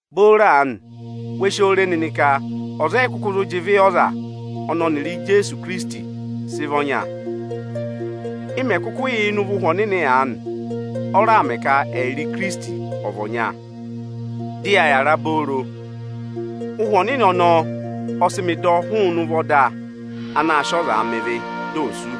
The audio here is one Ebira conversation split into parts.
Booro aanị, we si oo re nịnị ka ọza ọ yị kụkụ zụ jị ịvị yị ọza ọnị ọnịrị Ijeesu Ikirisiti sị vị ọnya. Ị mẹ̀ kụkụ yà ịnị ụvọ Ụhwẹ Ohomorihi aanị, ọ raà mẹ ka ẹyịrị Ikirisiti ọ̀ vị ọnya, dị ya yàra obooro. Ụhwẹ Ohomorihi ọnọọ ọ sị mị dọ hụụnị ụvọ ọda anaā sịị ọzaa mẹ ịvị, di o sú.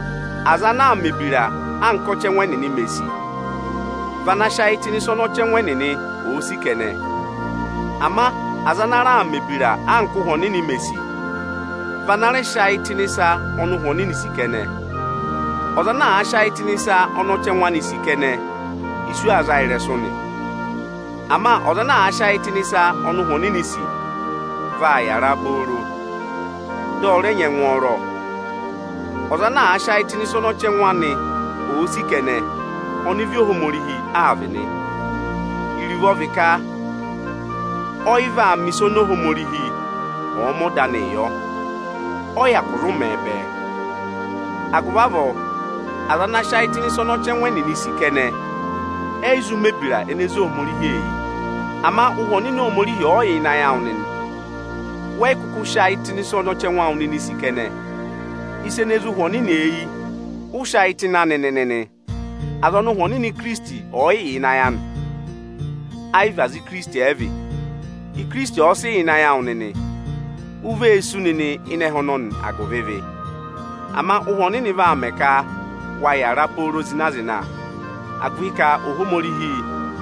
Aza ana aa mẹ̀ ebira anka ọchẹngụ ẹnịnị mè sì, vị ana sị ayị tụ́ nị ịsa ọnị ọchẹngụ ẹnịnị òo sì kẹnẹ. Ama aza ana raa mẹ̀ ebira anka Ụhwẹ Ohomorihi mè sì, vị ana rẹ sị ayị tụ́ ịnị ịsa ọnị Ụhwẹ Ohomorihi sì kẹnẹ. Ọza ana àa sị ayị tụ́ ịnị ịsa ọnị ọchẹngụ anị sì kẹnẹ, isu aa za a ịrẹsụ nị. Ama ọza ana àa sị ayị tụ́ ịnị ịsa ọnị Ụhwẹ Ohomorihi sì, vaa yàra obooro, dị ọ rẹ nyị ẹngwọọrọ. Ọza ana àa sị ayị tụ́ ịnị ịsa ọnị ọchẹngụ anị òo sị kẹnẹ, ọnịvị Ohomorihi aa vị nị. Iruvo ọ vị ka ọ yị vaa mẹ̀ ịsa oni Ohomorihi ọ̀ọ mẹ ọda anịị yọ; ọ yị hyakụ aa zụụ mẹẹ bẹẹ. Agụvị avọọ, aza ana sị ayị tụ́ ịnị ịsa ọnị ọchẹngụ ẹnịnị sì kẹnẹ, ẹ yị zụ mẹ̀ ebira ene zé Ohomorihi eyi. Ama Ụhwẹ Ohomorihi ọ̀ọ yà ịnị ayị ẹwụ nịnị, wẹ yị kụkụ sị ayị tụ́ ịnị ịsa ọnị ọchẹngụ awụ nịnị sì kẹnẹ. Ịsa ene zé Ụhwẹ Ohomorihi eyi, ụ sị ayị tụ́ ịnị anị nịnị nị. Aza ọnị Ụhwẹ Ikirisiti ọ̀ yị yà ịnị ayị anị, ẹ yị vị aza anị ẹ vị. Ikirisiti ọ̀ọ sị yà ịnị ayị awụ nịnị, u vee sú nịnị ịnị ẹhẹ ọnọnị agụvị ịvị. Ama Ụhwẹ Ohomorihi vaa mẹ ka wa yàra nịnị pooro zịna-zịna, agụvị ka Ohomorihi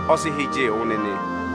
ọ sị ịhị jị yị wụ nịnị.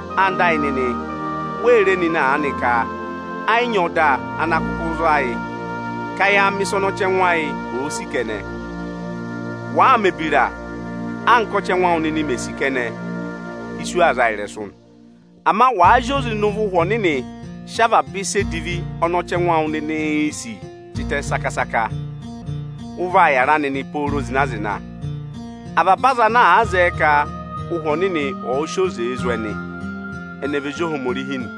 Ẹwụ nịnị ẹyịnyara amị, wee re nịnị aanị ka ẹ yị ọda ana kụkụ za yị ka ya a mẹ̀ ịsa ọnị ọchẹngụ ayị òo sì kẹnẹ. Wàa mẹ̀ ebira anka ọchẹngụ awụ nịnị mè sì kẹnẹ, isu aa za a ịrẹsụ nị. Ama wàa zị oze ịnị ụvọ Ụhwẹ Ohomorihi sị ịsa edivi ọnị ọchẹngụ awụ nịnịị̄ sì tịtẹ saka-saka, ụ vaa yàra nịnị pooro zịna-zịna. Avaba aza ana àa zẹẹ ka Ụhwẹ Ohomorihi ọ̀ọ sị oze zụ̀ ẹnị, ẹnị ẹ vị ezi Ohomorihi nị.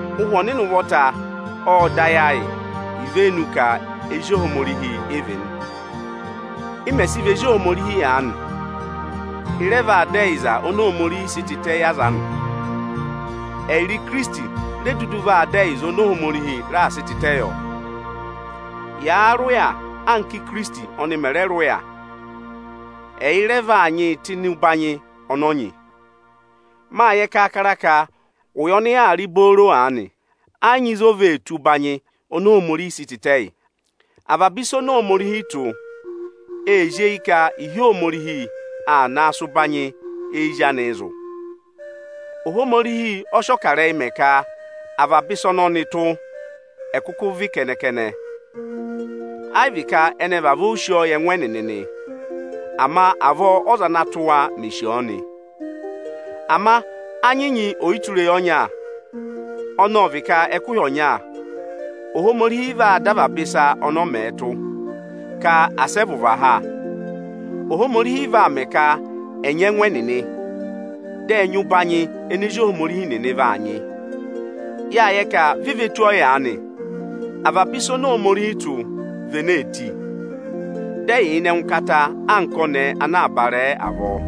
Ụhwẹ Ohomorihi ộ dọ ayị ayị ivenu ka ezi Ohomorihi ị vị nị. Ị mẹ̀ sị vị ezi Ohomorihi aanị, ị rẹ vaa dọ ẹyịza oni Ohomorihi sị tịtẹ yị aza anị. Ẹyịrị Ikirisiti re dudu vaa dọ ẹyịza oni Ohomorihi raà sị tịtẹ yọ. Yàa rị ụya, anka Ikirisiti ọnị mẹ̀ rẹ rị ụya, ẹyị rẹ vaa nyịị tụ́ ịnị ụbanyị ọnị ọ nyị. Mâ yẹ kaakara ka ụya ọnị yaa rị booro aanị, ẹ yị nyị ịzị o vee tù ụbanyị oni Ohomorihi sị tịtẹ yị. Avaba ịsa oni Ohomorihi tụ́, ee zí eyi ka ịhị Ohomorihi ana sị ụbanyị ezi anịị zụ̀. Ohomorihi ọ sị ọkarẹyị mẹ ka avaba ịsa ọnị ọnị tụ́, ẹ̀ kụkụ vị kẹnẹ-kẹnẹ. Ẹ yị vị ka ẹnị ẹ vavọọ sì ọ ọ yị ẹngụ ẹnịnị nị, ama avọọ ọza ana tụ́ wa mè sì ọọ nị. Ama â nyị ọyịtureyi ọnya, ọnị ọ vị ka ẹkụhị ọnya, Ohomorihi vaa dọ avaba ịsa ọnị ọ mẹ tụ́, asị ẹ vụ̀ va ha. Ohomorihi vaa mẹ ka ẹ̀ nyị ẹngụ ẹnịnị, dị ẹ̀ nyị ụbanyị ene ezi Ohomorihi nịị vaa nyị. Yâ yẹ ka vi ve tù ọyaanị, avaba ịsa oni Ohomorihi tụ́, vị ene ee tì, dị ẹ yà ịnị ẹngụkata anka ọnẹẹ ana aa barẹẹ avọọ.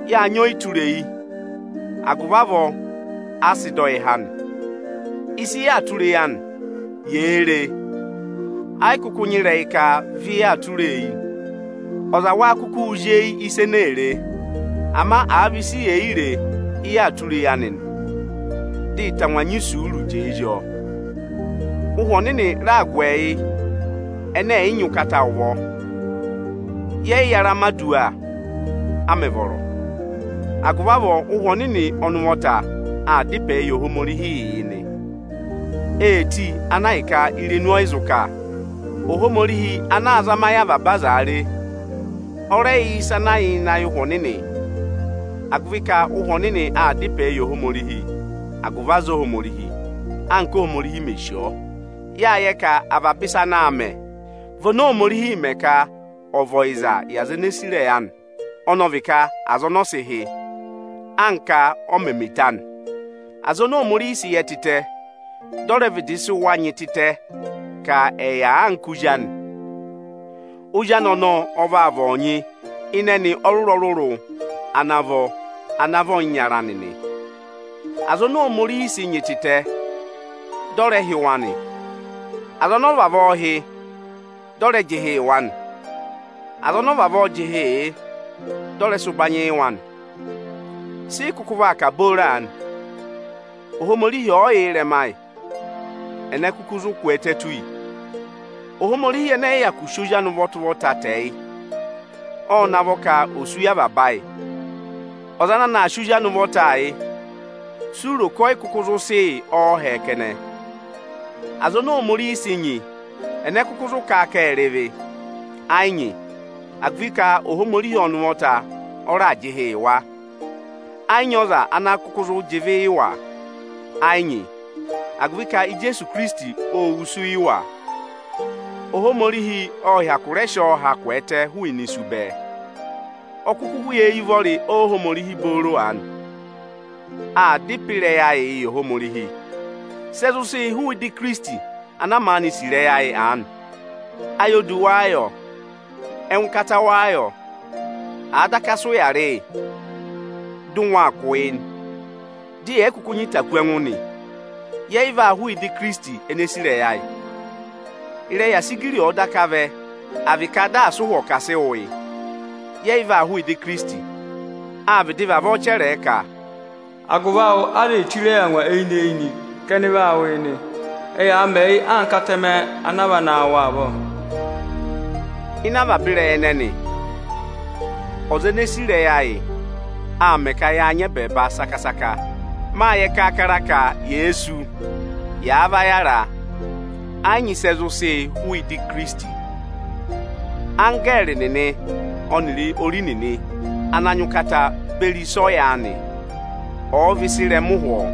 Yâ nyị ọyịtureyi, agụvị avọọ a sị dọ yị há nị. Ịsị yaa tụra eyi anị, yèee re e, ẹ yị kụkụ nyị ka vị yaa tụra eyi nị. Ọza wéé kukuū zí eyi ịsa ene ee re? Ama àa vị ịsị yè yi re, ị yaa tụra eyi anị nị, vị ị tangwa aa sị isuuruu jẹẹ zí ọọ nị. Ụhwẹ Ohomorihi raa gụ ẹyị ẹnẹ ẹ̀ yị nyị ụkata ụvọ. Yẹ yị yara mẹ̀ aduwa, a mẹ̀ vọrọ; agụvị avọọ Ụ́hwẹ Ohomorihi ọnị ụvọta aa dá ịpẹẹ yị Ohomorihi yị nị. Ee tì ana ahịka irenu ọ yị zụ kà. Ohomorihi anaā zama ayị avaba azaa re, ọ rẹ yẹ ịsị ẹ yà ịnị ayị Ụhwẹ Anị, agụvị ka Ụhwẹ Ohomorihi aa dá ịpẹẹ yị Ohomorihi agụvị aza Ohomorihi, anka Óhomorihi mè sì ọ. Yâ yẹ ka avaba ịsa ana àa mẹ, vị oni Ohomorihiī mẹ ka ọ̀ vị ọyịza yị aza ene sì ịrẹyị anị; ọnọọ vị ka aza ọnị ọ sị hị́, anka ọ mẹ̀ mẹ eto anị. Aza oni Ohomorihi sị yẹ tịtẹ, dị ọ rẹ vịdị sị wa nyị tịtẹ ka ẹ̀ yà anka Ozi anị. Ozi anị ọnọọ ọ vaa vị ozi ịpaapa anị ịnị ẹnị ọrụrụ-ọrụrụ ana vọ ana vị ọyịnyara anị nị. Aza oni Ohomorihi sị nyị tịtẹ, dị ọ rẹ hị́ wa nị. Aza ọnọọ vavọọ hị́, dị ọ rẹ jị ịhị yị wa nyị. Aza ọnị ọ vavọọ jị ịhị yị, dị ọ rẹ sị ụbanyị yị wa nị. Sị ị kụkụ vaa kà booro aanị? Ohomorihi ọ̀ọ yà yị ịrẹma, ẹnẹ kụkụ zụ kwẹẹtẹ tù yi? Ohomorihi ẹnẹ ẹ̀ yị hyakụ sị Ozi anị ụvọta-ụvọta tẹ yị, ộ na a vọ ka ò sú yị avaba ayị. Ọza ana na aa sị Ozi anị ụvọtaa yị, si u ro ka ọ yị kụkụ zụ sị yị ọọhẹ kẹnẹ? Aza oni Ohomorihi sị nyị, ẹnẹ kụkụ zụ kà a ka ệ rị ịvị? Ẹ yị nyị, agụvị ka Ohomorihi ọnị ụvọta ọ raà jị ịhị yị wa. Áá nyị ọza ana kụkụ zụ jị ịvị yị wa? Ẹ yị nyị, agụvị ka Ijeesu Ikirisiti, ô wusu yị wa. Ohomorihi ộ hyakụ rẹ sị ọọ ha kwẹẹtẹ hụụnị isu bẹẹ. Ọ kụkụ yà eyi ụvọrị Ohomorihi booro aanị. Aa dá ịpẹ ịrẹyị ayịị yị Ohomorihi. Sị ẹ zụ sị yị hụụ ịdị Ikirisiti, ana maanị sì ịrẹyị ayị aanị? Ayodu wáá yọ? Ẹngụkata wáá yọ? Àa daka sị ụya rị yị, dị ụngwẹ aa kụ̀ yị, dị yẹ̀ yị kụkụ nyị ịta kú ẹngụ nị, yẹ yị vaa hụụ ịdị Ikirisiti ene sì ịrẹyị ayị. Ịrẹyị asigiri ọ̀ọ daka vẹ, à vị ka daa sị ụhwọ ka àa sịị wụ yị, yẹ yị vaa hụụ ịdị Ikirisiti. Â vịdị vavọọ chẹrẹ ẹ ka, “Agụvị awụ aza ee chire yi angwa eyinị-eyinị ka ẹnị vaa wụ̀ yị nị. Ẹ yaa mẹ yị anka atẹmẹ ana aa va naa wụ avọọ.” Ịnị avaba ịrẹyị ẹnẹnị, ọza ene sì ịrẹyị ayị, aa mẹ ka yaa nyị ẹbẹẹba saka-saka. Mâ yẹ kaakara ka yèe sú, yàa va yàra, ẹ yị nyị ịsị ẹ zụ sị yị hụụ ịdị Ikirisiti. Anggẹẹrị nịnị ọnịrị ori nịnị ana nyị ụkata beri ịsa ọyaanị, ọ̀ọ vị ịsa ịrẹma ụhwọọ,